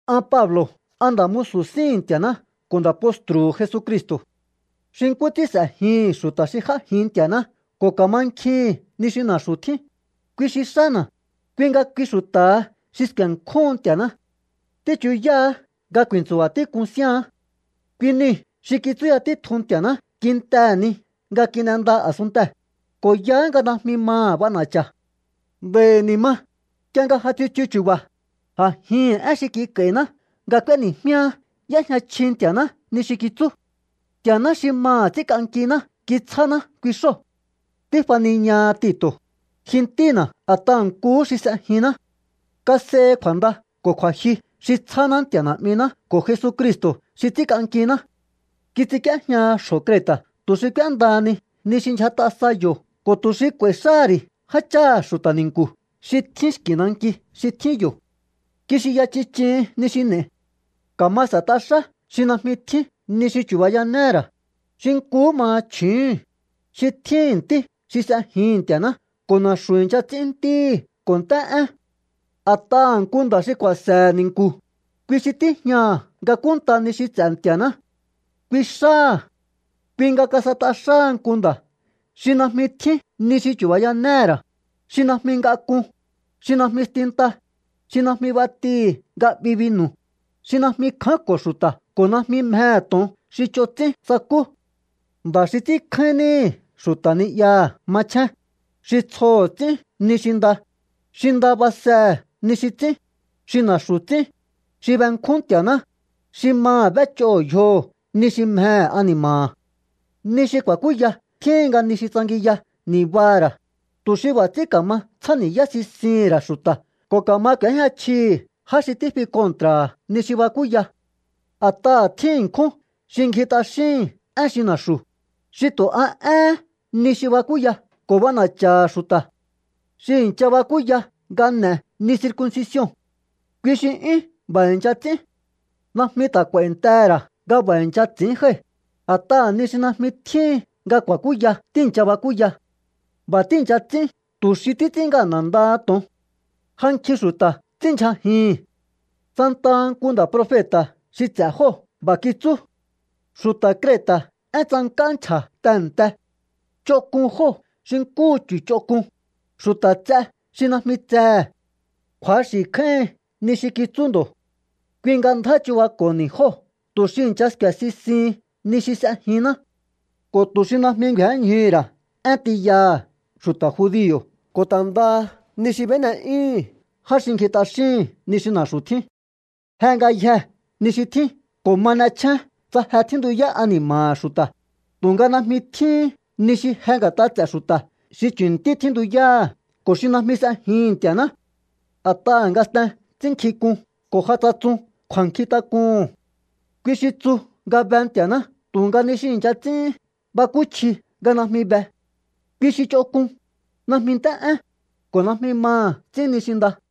An Pablo̱, an nda̱ musu̱ síhi̱n Nti̱a̱ná ko̱ nda̱ postru̱hu̱ Jesucristo̱. Xi nkú ts'ín s'e̱jihi̱n xu̱ta̱ xi j'ájin Nti̱a̱ná ko̱ ka̱mankjihi̱n ni xi na̱xu̱ tjín, kui xi xána̱, kui nga kui xu̱ta̱ha xi sku̱e̱nkjúhun Nti̱a̱ná. Tíchuyáá nga ku̱i̱ntsu̱ba̱ tík'un síaán. Kui niu̱ xi kitsúya títjun Nti̱a̱ná kintehe̱ ni nga kin'enda a̱sunntee̱, ko̱ yaá nga najmi maha̱ b'ana̱cha̱. Nd'a̱i̱ ni̱ ma, nk'ie nga ja tsichu chu̱ba̱, a̱jihi̱n én xi kik'a̱i̱na nga k'ueni̱jmíá y'éjña chji Nti̱a̱ná ni xi kitsú. Nti̱a̱ná xi maha̱ ts'ínk'ankiná kitsjána kui xóo̱. Tífaniñaha Tito̱, ji ntína̱ a̱t'aha̱ nkuhú xi s'ejinná. Kas'ehi kju̱a̱nda ko̱ kju̱a̱jyu xi tsjáná Nti̱a̱ Na̱'miná ko̱ Jesucristo̱ xi ts'ínk'ankiná. Kits'ink'íéjñaha xjo̱ Creta̱ tu̱ xi k'úéndahani ni xi kindyjat'a sa yo̱ ko̱ tu̱ xi k'u̱a̱i̱ xáha̱ ri̱ jácháha̱ xu̱ta̱ ni̱nku̱ xi tjín xki̱ nanki xi tjín yo̱. Kixinya chich'ihin ni xi n'e̱i. Ka̱ma s'e̱t'a xá xi najmi tjín ni xi chu̱bayanéhe̱ ra̱, xi nkuhú maha chju̱úhu̱n, xi tjíhi̱n ntí xi s'ejihi̱n Nti̱a̱ná ko̱ na̱xu̱ i̱ncha ts'ín ntíhi̱ ko̱ nt'é'én. A̱t'aha̱ nku nda̱ xi ku̱a̱se̱he̱ ni̱nku̱, kui xi tíjñaha̱ nga kúnnta ni xi ts'e̱ Nti̱a̱ná. Kui xáha̱. Kui nga kas'et'a xáha nku nda̱ xi najmi tjín ni xi chu̱bayanéhe̱ ra̱, xi najmi ngak'un, xi najmi stinta, xi najmi b'atihi̱ nga 'bi binu̱, xi najmi kjánko̱ xu̱ta̱ ko̱ najmi mjehe̱ to̱on xi ch'on ts'ín sakú. Nda̱ xi ts'ínkjáín níhi̱ xu̱ta̱ ni'yaha̱ machjén, xi tsjoho̱ ts'ín ni xi nda, xi nda basehe̱ ni xi ts'ín, xi na̱xu̱ ts'ín, xi benkjún Nti̱a̱ná, xi maha̱ b'éch'oho̱ yjoho̱ ni xi mjehe̱ ani̱ma̱ha̱. Ni xi ku̱a̱kúya tjíhin nga ni xi tsangiya ni̱baha̱ ra̱, tu̱ xi b'a̱ ts'ín ka̱ma tsjáni̱yá sisihi̱n ra̱ xu̱ta̱ ko̱ ka̱ma k'u̱éjña chjihi̱ já xi tífi kontra̱ha̱ ni xi bakúya. A̱t'aha̱ tjín ṉkjún xi ngji t'axíhi̱n én xi na̱xu̱, xi tu̱ a éhén ni xi bakúya ko̱ b'ana̱cha̱ha̱ xu̱ta̱. Xi i̱ncha bakúya nga n'e̱ ni circuncision, kui xi 'yún b'a̱ i̱ncha ts'ín. Najmi ta̱ k'u̱a̱i̱ntehe̱ ra̱ nga b'a̱ i̱ncha ts'i̱ín jái̱, a̱t'aha̱ ni xi najmi tjíhin nga ku̱a̱kúya tíi̱ncha bakúya. B'a̱ tíi̱ncha ts'ín tu̱ xi títs'ín ngana̱ ndaha to̱on. Ja nkjin xu̱ta̱ ts'ínndyjajihi̱n. Santaha nku nda̱ profeta̱ xi ts'e̱ jóo̱ b'a̱ kitsú: “Xu̱ta̱ Creta̱ én tsank'á nchja̱ tehe̱nte. Ch'onk'un jóo̱ xi nkúhu chu̱ ch'onk'un, xu̱ta̱ ts'e xi najmi tsehe̱.” Kju̱axi̱ kjáíhin ni xi kitsú ndo̱. Kui nga ndjá chu̱bako̱honi jóo̱ tu̱ xi i̱ncha sku̱e̱ sisihin ni xi s'ejinná ko̱ tu̱ xi najmi ngju̱énñjuhu̱ ra̱ én tiyaha̱ xu̱ta̱ judio̱ ko̱ ta̱ ndaha ni xi b'éne'yúhu̱n já xi ngji t'axíhi̱n ni xi na̱xu̱ tjín. Je ngayjee̱ ni xi tjín ko̱ ma n'echjén tsa je tjíntuyá ani̱ma̱ha̱ xu̱ta̱, tu̱nga najmi tjíhín ni xi je nga̱t'a ts'e̱ xu̱ta̱ xi chu̱ntí tjíntuyáha̱ ko̱ xi najmi s'ejihi̱n Nti̱a̱ná. A̱t'aha̱ ngasten ts'ínnkjink'un ko̱ ja tsatsun kju̱a̱nkjintak'uhu̱n. Kui xi tsu nga be Nti̱a̱ná tu̱nga ni xi i̱ncha ts'íhín bakúchji nga najmi be. Kui xi ch'onk'un, najmi nt'é'én, ko̱ najmi maha̱ ts'ín ni xi nda.